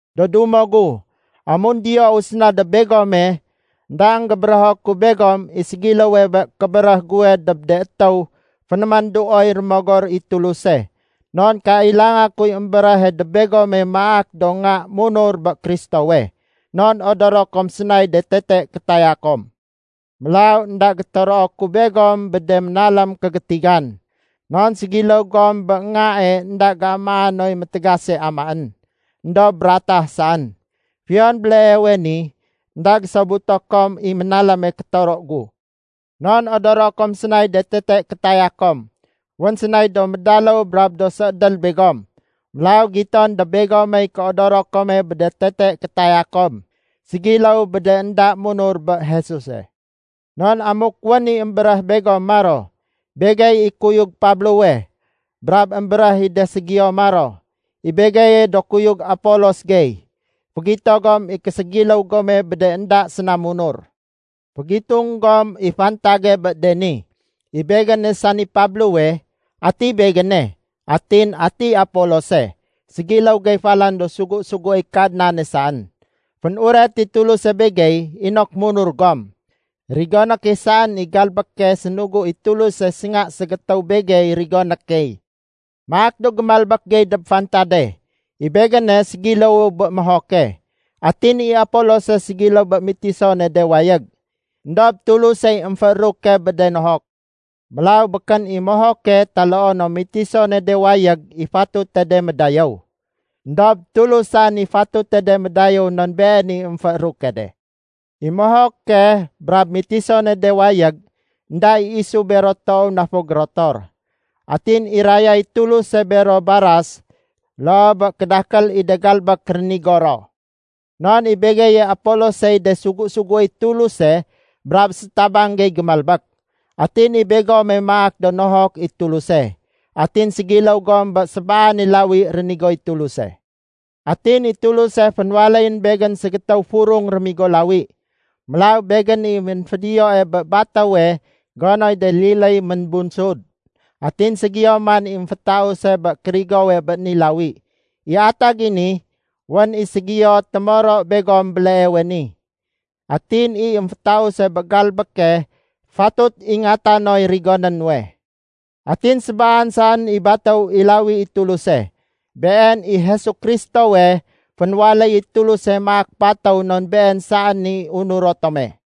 Do dumo gu, amun diyou séna dob begome, énda énggébérého ku begom i ségiléwe bé kébéréh guwe dob de étéw fénémanduoy Rémogor i Tuluse. Non kailanga kuy émbéréhe dob begome maak do nga munur bé Kristowe. Non odoro kom sénay de tete kétaya kom. Mélaw énda gétoroo ku begom bé de ménalém kégétigan, non ségiléw gom bé ngae énda géamaa noy métégase amaén, éndob ratah saén. Fiyon béleewe ni, énda gésobuto kom i ménaléme kétoro gu. Non odoro kom sénay de tete kétaya kom. Wén sénay do médaléw brab do séédél begom. Mélaw giton dob begomey kéodoro kome bé de tete kétaya kom, ségiléw bé de énda munur bé Jesuse. Non amuk wén i émbéréh begom maro, “Begey i kuyug Pablowe”, brab émbéréh i de ségiyo maro, “I begeye do kuyug Apolos gey”, fégito gom i késégiléw gome bé de énda séna munur. Fégitung gom i fantage bé de ni. I begéne, sani Pablowe, ati begéne? Atin ati Apolose? Ségiléw gey falan do sugu-suguéy Kadnane saén. Fénuret i Tuluse begey inok munur gom. Rigoné key saén i galbéke sénugu i Tuluse sénga ségétéw begey rigoné key. Maak do gémalbék gey dob fantade. I begéne ségiléwu bé mohoke. Atin i Apolose ségiléw bé mitisone de wayég. Endob Tulusey émfééruke bé de nohok. Mélaw békén i mohoke taloo no mitisone de wayég i fatute de médayéw. Endob Tulus saén i fatute de médayéw non Been i émfééruke de. I mohoke brab mitisone de wayég, énda i isu bero toow na fo gérotor. Atin irayay Tuluse bero baras loo bé kédakél i de galbék rénigo ro. Non i begeye Apolosey de sugu-suguéy Tuluse brab sétabang gey gémalbék. Atin i begome maak do nohok i Tuluse. Atin ségiléw gom bé sébaane lawi rénigoy Tuluse. Atin i Tuluse fénwaléyén begén ségétéw furung rémigo lawi. Mélaw begén i ménfédiyoe bé batéwe gonoy de liléy ménbunsud. Atin ségiyo man i émfétause bé kérigowe bé ni lawi. I atag i ni, wén i ségiyo témoro begom béleewe ni. Atin i émfétause bé galbéke fatut ingata noy rigoné nuwe. Atin sébaan saén i batéw i lawi i Tuluse. Been i Jesu Kristowe fénwaléy i Tuluse maak batéw non Been saén i unuro tome.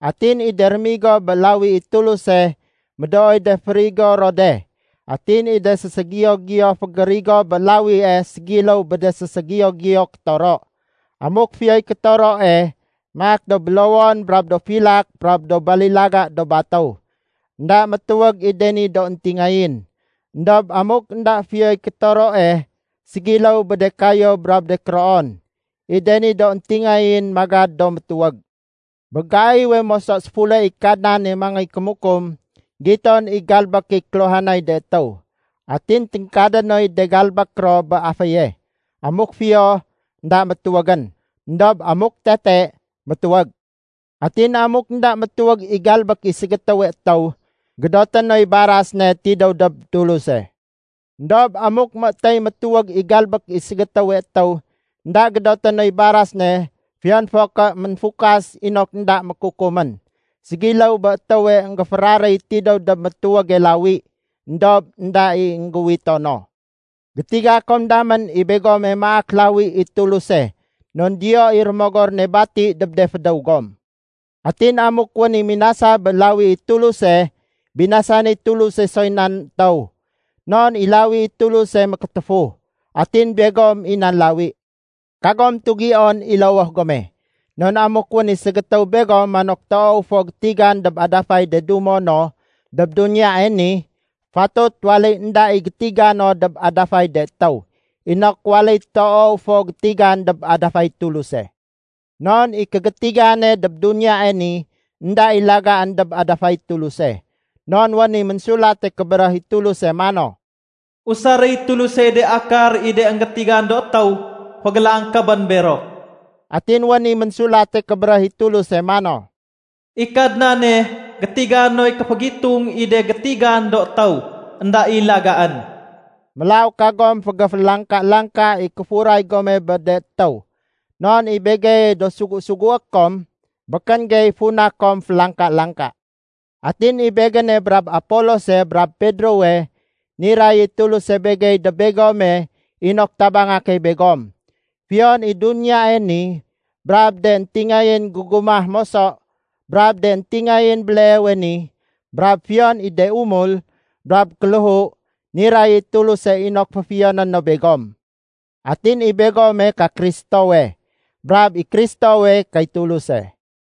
Atin i de rémigo bé lawi i Tuluse, médooy de fégérigo ro de. Atin i de séségiyo-giyo fégérigo bé lawie ségiléw bé de séségiyo-giyo kétoro. Amuk fiyoy kétoroe maak do bélowon brab do filak brab do balilaga do batéw. Enda métuwég i de ni do éntingayén. Endob amuk énda fiyoy kétoroe, ségiléw bé de kayéw brab do kéroon. I de ni do éntingayén magad do métuwég. Bé gaiwe moso séfule i Kadnane mangéy kémukum, giton i galbék i kéluhanay de étéw. Atin téngkadé noy de galbék ro bé aféye. Amuk fiyo, énda métuwégén. Endob amuk tete, métuwég. Atin amuk énda métuwég i galbék i ségétéwe étéw, gédoté noy baras ne tidéw dob Tuluse. Endob amuk météy métuwég i galbék i ségétéwe étéw, énda gédoté noy baras ne fiyon fo ké ménfukas inok énda mékukumén. Ségiléw bé étéwe énggéféraréy tidéw dob métuwége lawi éndob énda i énggéuwito no. Gétiga kom damén i begome maak lawi i Tuluse non diyo i Rémogor ne bati dob de fédéw gom. Atin amuk wén i minasa bé lawi i Tuluse, binasanéy Tuluse soy nan étéw, non i lawi i Tuluse mékétéfu. Atin begom i nan lawi. Kagom tugion i lowoh gome. Non amuk wén i ségétéw begom manok toow fo gétigan dob adafay de dumo no dob duniyae ni, fatut waléy énda i gétiga no dob adafay de étéw, inok waléy toow fo gétigan dob adafay Tuluse. Non i kégétigane dob duniyae ni énda i lagaén dob adafay Tuluse. Non wén i Ménsulate Kébéréh i Tuluse mano, “Usaréy Tulusey de akar i de énggétigan do étéw fégélangkébén bero.” Atin wén i Ménsulate Kébéréh i Tuluse mano, “I Kadnane gétiga noy kéfégitung i de gétigan do étéw énda i lagaén.” Mélaw kagom fégéfélangka-langka i kéfuray gome bé de étéw. Non i begeye do sugu-sugué kom, békén gey funa kom félangka-langka. Atin i begéne brab Apolose brab Pedrowe, niray i Tuluse begey dob begome inok tabanga key begom. Fiyon i duniyae ni, brab de éntingayén gégumah moso, brab de éntingayén béleewe ni, brab fiyon i de umul brab kéléhu, niray i Tuluse inok féfiyoné no begom. Atin i begome ka Kristowe, brab i Kristowe kay Tuluse.